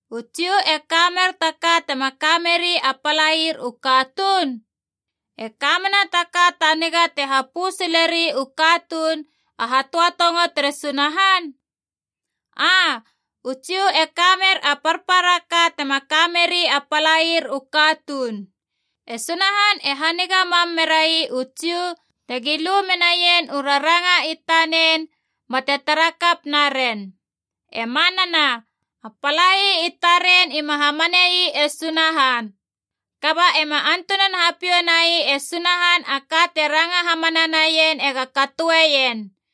U Jiu e kamer ta ka tema kameri a palair u katuun? E ka mena ta ka ta niga te hapö sileri u katuun a hatöatongo tere Sunahan? Aa, u Jiu e kamer a parpara ka tema kameri a palair u katuun. E Sunahan e haniga mam merai u Jiu tegi lu menaien u raranga i tanen bate tara kap naren. E manana, a palai i taren ima hamanei e Sunahan. Kaba ema antunan hapiou nai e Sunahan a ka te ranga hamana naien ega katoeien.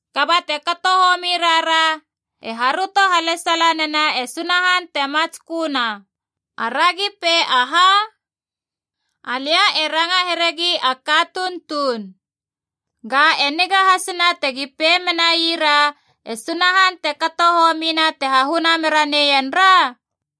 Kaba te kato homi rara e haröto halesala nena e Sunahan te matsköna, aragi pei aha? (Alia e ranga heregi a katuun tuun.) Ga e niga hasina tegi pei menaira e Sunahan te kato homina te hahuna mera neien ra?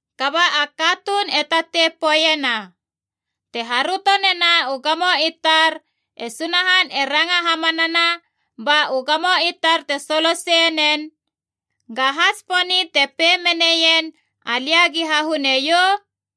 Kaba a katuun e tatei poeiena, “Te haröto nena u gamo i tar e Sunahan e ranga hamanana ba u gamo i tar te soloseie nen, gaha tsiponi te pei meneien alia gi hahune iou?”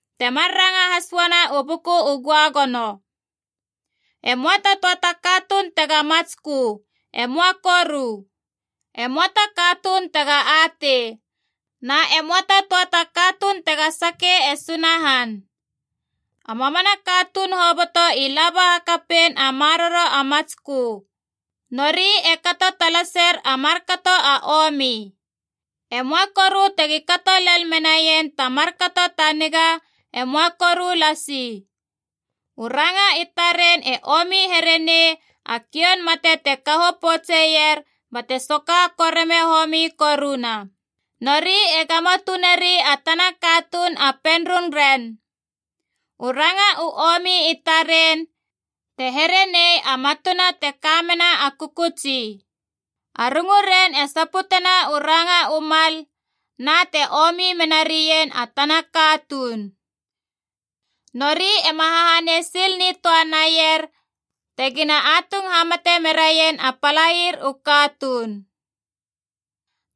Temar ranga has uana u Buku u Göagono: “E möa ta töa ta katuun tega matskö, e möa koru. E möa ta katuun tega atei. Na e möa ta töa ta katuun tega sake e Sunahan. A mamana katuun hoboto i laba hakapein a maroro a matskö. Nori e kato talaser a markato a omi. E möa koru tegi kato lel menaien ta markato ta niga, e möa koru lasi. U ranga i taren e omi here nei a kioun mate te kaho poutseier bate soka koreme homi koruna, nori e gamo tuneri a tana katuun a penrung ren. U ranga u omi i taren, te here nei a matuna te ka mena a kökötsi. A runguren e saputena u ranga u mal, na te omi menarien a tana katuun. Nori e ma hahanei sil nitöa naier tegina atung hamate meraien a palair u katuun.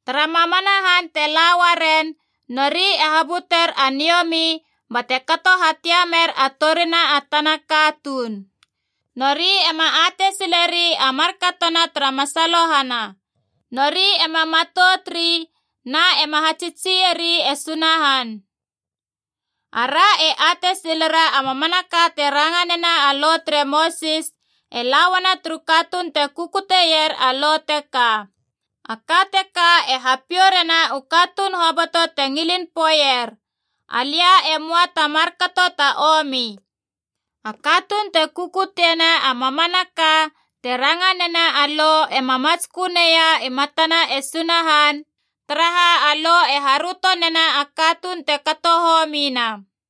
Tara mamana han te la uaren, nori e habuter a niomi bate kato hatiamer a torina a tana katuun. Nori ema atei sileri a markatona tara masalohana. Nori ema matout ri na ema hatsitsieri e Sunahan.” Ara e atei silera a mamanaka te ranga nena a Lo tere Mosis e la uana turu katuun te kukuteier a Lo teka. A ka teka e hapiou rena u katuun hoboto te ngilin poeier, “Alia e möa ta markato ta omi.” A katuun te kukutiena a mamanaka te ranga nena a Lo ema matskö neia i matana e Sunahan, taraha a Lo e haröto nena a katuun te kato homina.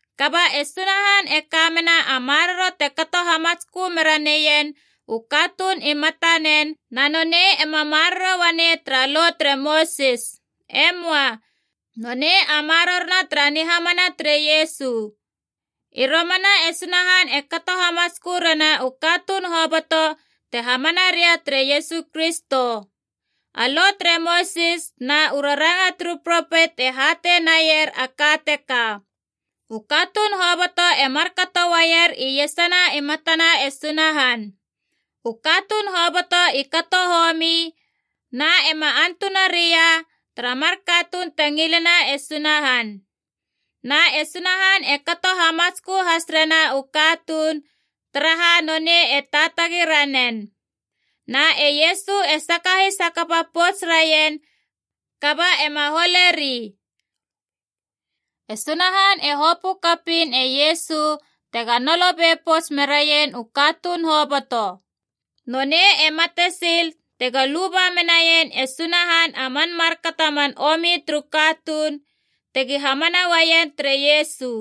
Kaba e Sunahan e ka mena a maroro te kato hamatskö mera neien u katuun i matanen, na nonei ema maroro uanei tara Lo tere Mosis. E möa. Nonei a marorona tara nihamana tere Iesu. I romana e Sunahan e kato hamatskö rena u katuun hoboto te hamana ria tere Iesu Kristo. A Lo tere Mosis na u raranga turu propet e hatei naier a ka teka. U katuun hoboto e markato uaier iesana i matana e Sunahan. U katuun hoboto i kato homi na ema antuna ria tara mar katuun te ngilena e Sunahan. Na e Sunahan e kato hamatskö has rena u katuun, taraha nonei e taatagi ranen. Na e Iesu e sakahis hakapa pouts raien kaba ema holeri. E Sunahan e hopö kapiin e Iesu tega nolo be pouts meraien u katuun hoboto. Nonei e mate sil tego luba menai e Sunahan a man markato a man omi turu katuun, tegi hamana uaien tere Iesu.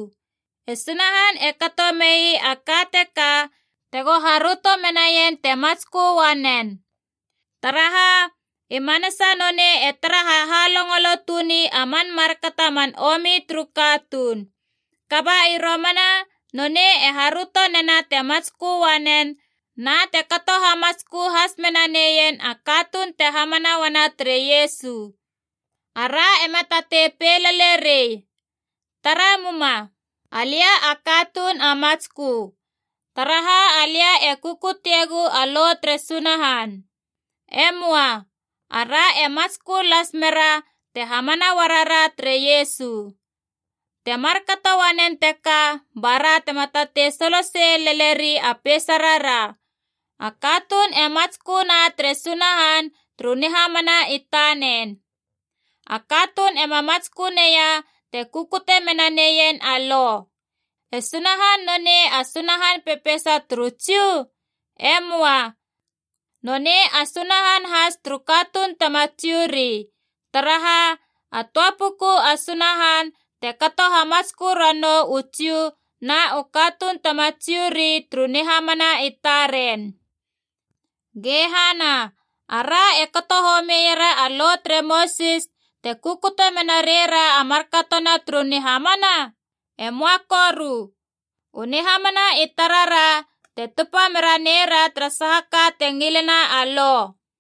E Sunahan e kato mei a ka teka tego haröto menaien te matskö uanen. Taraha, i manasa nonei e tara hahalongolo tuni a man markato a man omi turu katuun. Kaba i romana nonei e haröto nena te matskö uanen na te kato hamatskö has mena neien a katuun te hamana uana tere Iesu. Ara ema tatei pei lele rei, “Tara muma. Alia a katuun a matskö, taraha alia e kukutiegu a Lo tere Sunahan.” E möa. Ara e matskö las mera te hamana uarara tere Iesu. Te markato uanen teka bara tema tatei solosei lele rei a peisarara. A katuun e matsköna tere Sunahan turu nihamana i tanen. A katuun ema matskö neia te kukute menaneien a Lo. E Sunahan nonei a Sunahan pepeisa turu Jiu? E moa. Nonei a Sunahan has turu katuun tema Jiu ri. Taraha, a töa puku a Sunahan te kato hamatskö ranou u Jiu na u katuun tema Jiu ri turu nihamana i taren. Ge hana, ara e kato homiera a Lo tere Mosis te kukute mena reira a markatona turu nihamana? E moa koru. U nihamana i tarara te tupa mera neira tara saha ka te ngilena a Lo.